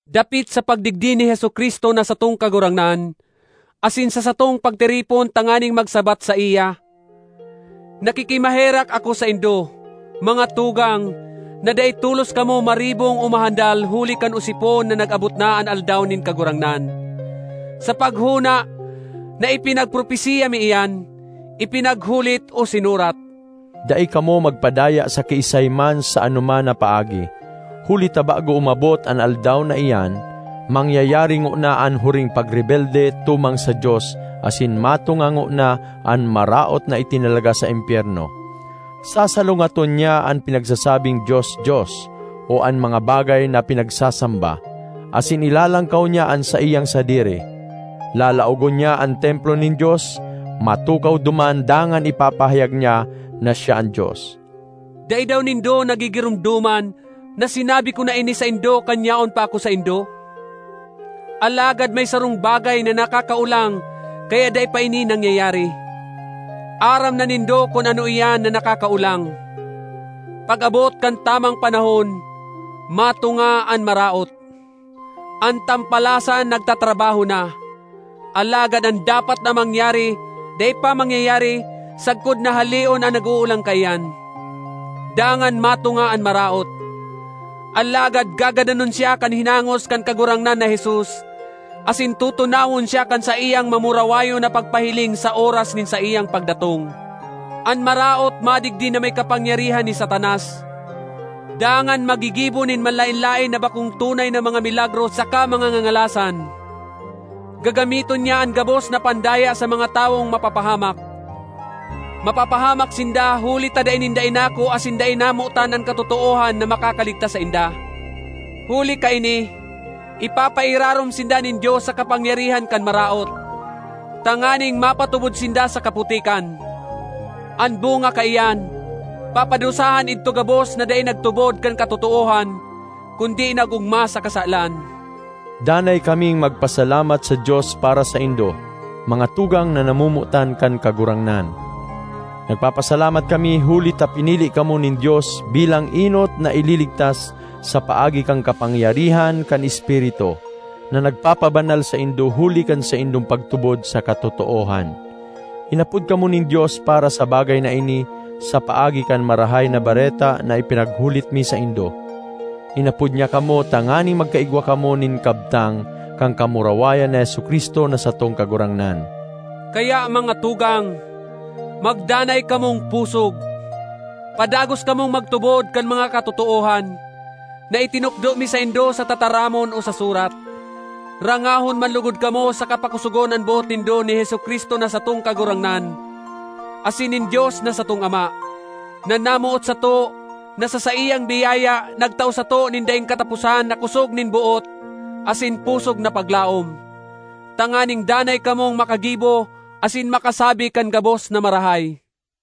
Dapit sa pagdigdi ni Jesu-Cristo na satong Kagurangnan asin sa satong pagtiripon tanganing magsabat saiya, nakikimaherak ako saindo, mga tugang, na dai tolos kamo maribong o mahandal huli kan osipon na nag-abot na an Aldaw nin Kagurangnan, sa paghona na ipinagpropesiya mi iyan, ipinaghulit, o sinurat. Dai kamo magpadaya sa kiisay man sa anoman na paagi. Huli ta bago umabot an Aldaw na iyan mangyayari ngona an huring pagrebelde tumang sa Dios asin matunga ngona an Maraot na itinalaga sa impyerno. Sasalungaton niya an pinagsasabing dios-dios o an mga bagay na pinagsasamba, asin ilalangkaw niya an saiyang sadiri. Lalaogon niya an Templo nin Dios, matukaw duman dangan ipapahayag niya na siya an Dios. Dai daw nindo nagigiromdoman na sinabi ko na ini saindo kan yaon pa ako saindo? Alagad may sarong bagay na nakakaolang kaya dai pa ini nangyayari; aram na nindo kun ano iyan na nakakaolang. Pag-abot kan tamang panahon, matunga an Maraot. An Tampalasan nagtatrabaho na, alagad an dapat na mangyari dai pa mangyayari sagkod na haleon an nag-oolang kaiyan. Dangan matunga an Maraot, alagad gagadanon siya kan hinangos kan Kagurangnan na Jesus asin tutunawon siya kan saiyang mamurawayon na pagpahiling sa oras nin saiyang pagdatong. An Maraot madigdi na may kapangyarihan ni Satanas dangan maggigibo nin manlaen-laen na bakong tunay na mga milagro saka mga ngangalasan. Gagamiton niya an gabos na pandaya sa mga tawong mapapahamak. Mapapahamak sinda huli ta dai ninda inako asin dai namotan an katotoohan na makakaligtas sainda. Huli kaini ipapairarom sinda nin Dios sa kapangyarihan kan maraot, tanganing mapatubod sinda sa kaputikan. An bunga kaiyan, papadusahan idto gabos na dai nagtubod kan katotoohan kundi nag-ogma sa kasalan. Danay kaming magpasalamat sa Dios para saindo, mga tugang na namomotan kan Kagurangnan. Nagpapasalamat kami huli ta pinili kamo nin Dios bilang enot na ililigtas sa paagi kan kapangyarihan kan Espiritu, na nagpapabanal saindo huli kan saindong pagtubod sa katotoohan. Inapod kamo nin Dios para sa bagay na ini sa paagi kan Marahay na Bareta na ipinaghulit mi saindo; inapod niya kamo tanganing magkaigwa kamo nin kabtang kan kamurawayan ni Jesu-Cristo na satong Kagurangnan. Kaya, mga tugang, magdanay kamong pusog; padagos kamong magtubod kan mga katotoohan na itinukdo mi saindo sa tataramon o sa surat. Rangahon man logod kamo saka pakosogon an boot nindo ni Jesu-Cristo na satong Kagurangnan asin nin Dios na satong Ama, na namoot sato, na sa saiyang biyaya nagtao sato nin daing kataposan na kosog nin boot asin pusog na paglaom, tanganing danay kamong makagibo asin makasabi kan gabos na marahay.